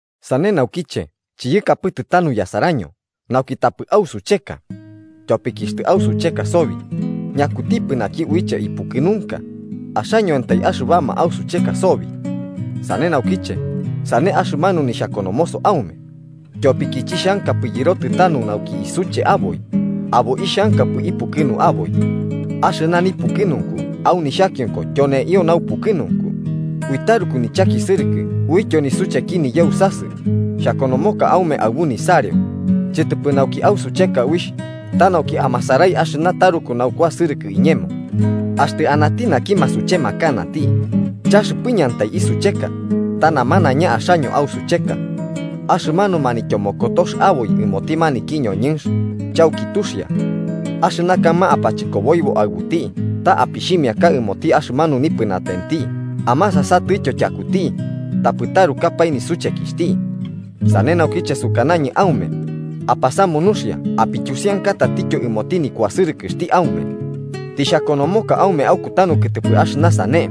Sane naukiche chiyakapɨtɨ tanu yasaraño nauki tapɨ usucheka. Tyopiki axtɨ ausucheka sobi, ¿ñakutipɨ naki uiche ipukɨnunka, axañoantai axɨbama ausucheka sobi? Sane naukiche sane axɨmanu nixhakonomoso aume, tyopiki chixhankapɨ yɨrotɨ tanu nauki isuche aboi, abo ixhankapɨ ipukɨnu aboi. Axɨna nipukɨnunku au nixhakionko tyoneintyo naupukɨnunku, ui taruku nichakisɨrɨkɨ uityo nisucheki niyausasɨ xhakonomoka aume aɨbu nisareo, chɨtɨpɨ nauki ausucheka uixh, ta nauki amasarai axɨna taruku naukuasɨrɨkɨ iñemo. Axtɨ anati naki masuchemakanati, chaxɨpɨñɨantai isucheka, ta namanaiña axaño ausucheka. Axɨmanu manityomokotox aboi ɨmoti maniki ñoñɨnx, chauki tuxia. Axɨna kaɨma apachɨkoboibo aɨbuti ta apixhimiaka ɨmoti axɨmanu nipɨnatenti amasasatɨtyo tyakuti, tapɨ tarukapae nisuchekixhti. Sane naukiche sukanañɨ aume apasamu nuxia apityusianka tatityo ɨmoti nikuasɨrɨkɨxti aume. Tixhakonomoka aume aukutanu kɨtɨpɨ axɨna sane,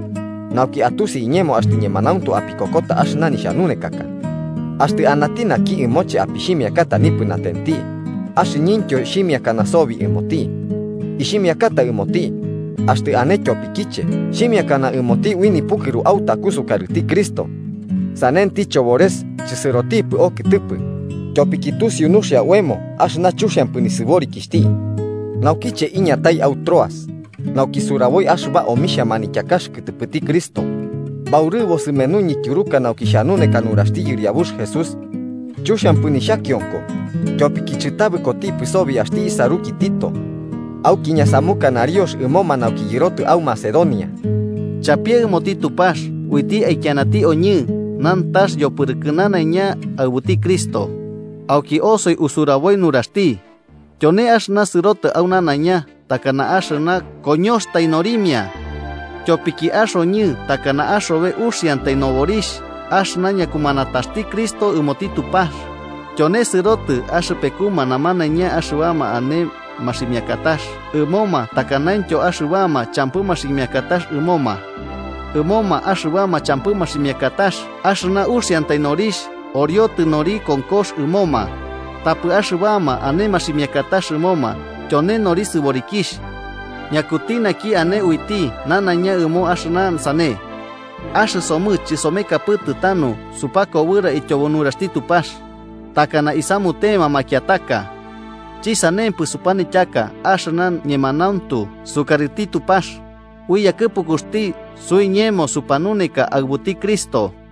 nauki atusi iñemo axtɨ ñemanauntu apikokota axɨna nixhanunekaka. Axtɨ anati naki ɨmoche apixhimiakata nipɨnatenti, axɨñɨntyo xhimiakana sobi ɨmoti. Ixhimiakata ɨmoti, axtɨ ane tyopikiche xhimiakana ɨmoti ui nipukɨru autaku sukarɨti Cristo. Sanenti chobores chɨsɨrotipɨ okɨtɨpɨ, tyopiki tusiu nuxia oemo axɨna chuxiampɨ nisɨborikixhti. Naukiche iñatai au Troas, nauki suraboi axɨba omixhia manityakax kɨtɨpɨti Cristo, baurɨbo sɨmenuñɨ tyuruka nauki xhanuneka nuraxti Yɨriabux Jesús. Chuxiampɨ nixhakionko, tyopiki chɨtabɨkotipɨ sobi axti isaruki Tito. Auki ñasamuka nariox ɨmoma nauki yɨrotɨ au Macedonia. Chapie ɨmoti Tupax uiti aikianati oñɨ nantax yopɨrɨkɨ nanaiña aɨbuti Cristo, auki osoi usuraboi nuraxti, tyone axɨna sɨrotɨ au nanaiña takana axɨna koñoxatai norimia. Tyopiki axoñɨ takana axobe uxiantai noborixh axɨna ñakumanataxti Cristo ɨmoti Tupax, tyone sɨrotɨ axɨpekuma namanaiña axɨbama ane maximiakatax ɨmoma takanaintyo axɨbama champɨ maximiakatax ɨmoma. Ɨmoma axɨbama champɨ maximiakatax axɨna uxiantai norixh oriotɨ nori konkox ɨmoma, tapɨ axɨbama ane maximiakatax ɨmoma tyone nori sɨborikixh. ¿Ñakuti naki ane uiti nanaiña ɨmo axɨna sane? Axɨsomɨ chɨsomekapɨtɨ tanu supakobɨra ityobo nuraxti Tupax, takana isamutema makiataka. Chɨsanempɨ, supanityaka axɨna ñemanauntu sukarɨti Tupax, ui yakɨpukuxti suiñemo supanuneka aɨbuti Cristo.